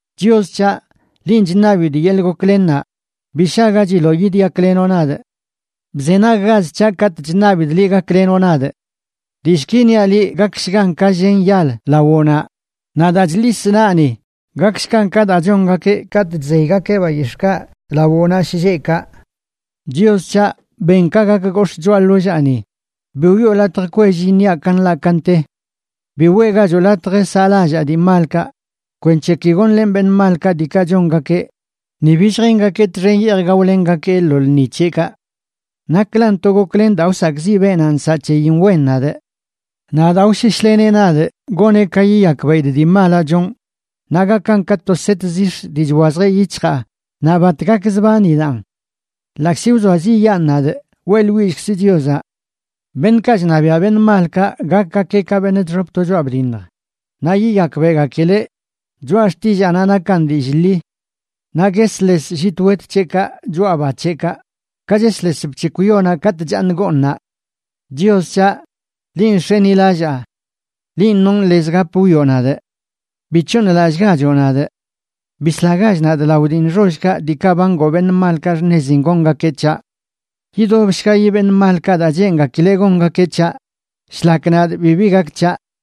Chios c̱haꞌ, linꞌ chṉabidꞌ yeḻꞌ goklennaꞌ, ¡bi shagachiloꞌ yidyaklenoꞌ nadꞌ! Bzenaggach c̱haꞌ katꞌ chṉabidꞌ liꞌ gaklenoꞌ nadꞌ. Dillꞌki niaꞌ liꞌ gakshgan ka llen yal lawoꞌnaꞌ, naꞌ daa chḻisꞌ naꞌni gakshgan ka daa chongakeꞌ katꞌ chzeygakeꞌ bayix̱ꞌkaꞌ lawoꞌnaꞌ shlleꞌkaꞌ. Chios c̱haꞌ, ben ka gak gox̱ꞌ choꞌa ḻollaani; bi wiꞌo latj kwell iṉiaꞌ ka nḻaꞌ ka nte. Bi weꞌgachoꞌ latj saꞌlallaa dii malkaꞌ, kwenc̱he ki gonlenꞌ beṉꞌ malkaꞌ diikaꞌ chongakeꞌ, ni bi lljengakee txen yeej gaolenꞌgakee lo lṉi c̱heꞌkaꞌ. Naklan to goklen daa wsakꞌziꞌ beenaꞌ nsaꞌ c̱heyin wen nadꞌ; naꞌ daa wsheshleneꞌ nadꞌ goneꞌ ka yiyakbeꞌidꞌ dii malaꞌ chonꞌ naꞌ gakan ka to set zix̱ dii chwazjeꞌ yic̱hjaa naꞌ bat gakzbanidaꞌn. Ḻaꞌkzi wzoaziꞌyaan nadꞌ, weꞌḻwillkzꞌ Chiozaꞌ. Beṉꞌkaꞌ chṉabiaꞌ beṉꞌ malkaꞌ gakgakeꞌ ka beṉꞌ chxop to choꞌa bdiṉj, naꞌ yiyakbeꞌgakileꞌ choꞌa xtillaanaꞌ nakan dillꞌ ḻi. Naꞌ guesles llit wet c̱heꞌkaꞌ choꞌa ba c̱heꞌkaꞌ, ka chesles bc̱hekw yonaꞌ katꞌ chaaṉ gooṉaꞌ. Chios c̱haꞌ, linꞌ nx̱enilallaa. Linꞌ nonꞌ lez gap wwioꞌ nadꞌ. Bi c̱hooṉlallꞌgachoꞌ nadꞌ. Bislagach nadꞌ lao dii nxollkaꞌ diikaꞌ ba ngoo beṉꞌ malkaꞌ xṉezin gongakeꞌ c̱haꞌ. Yidobshgayi beṉꞌ malkaꞌ daa cheengakileꞌ gongakeꞌ c̱haꞌ, shlak nadꞌ bibi gak c̱haꞌ.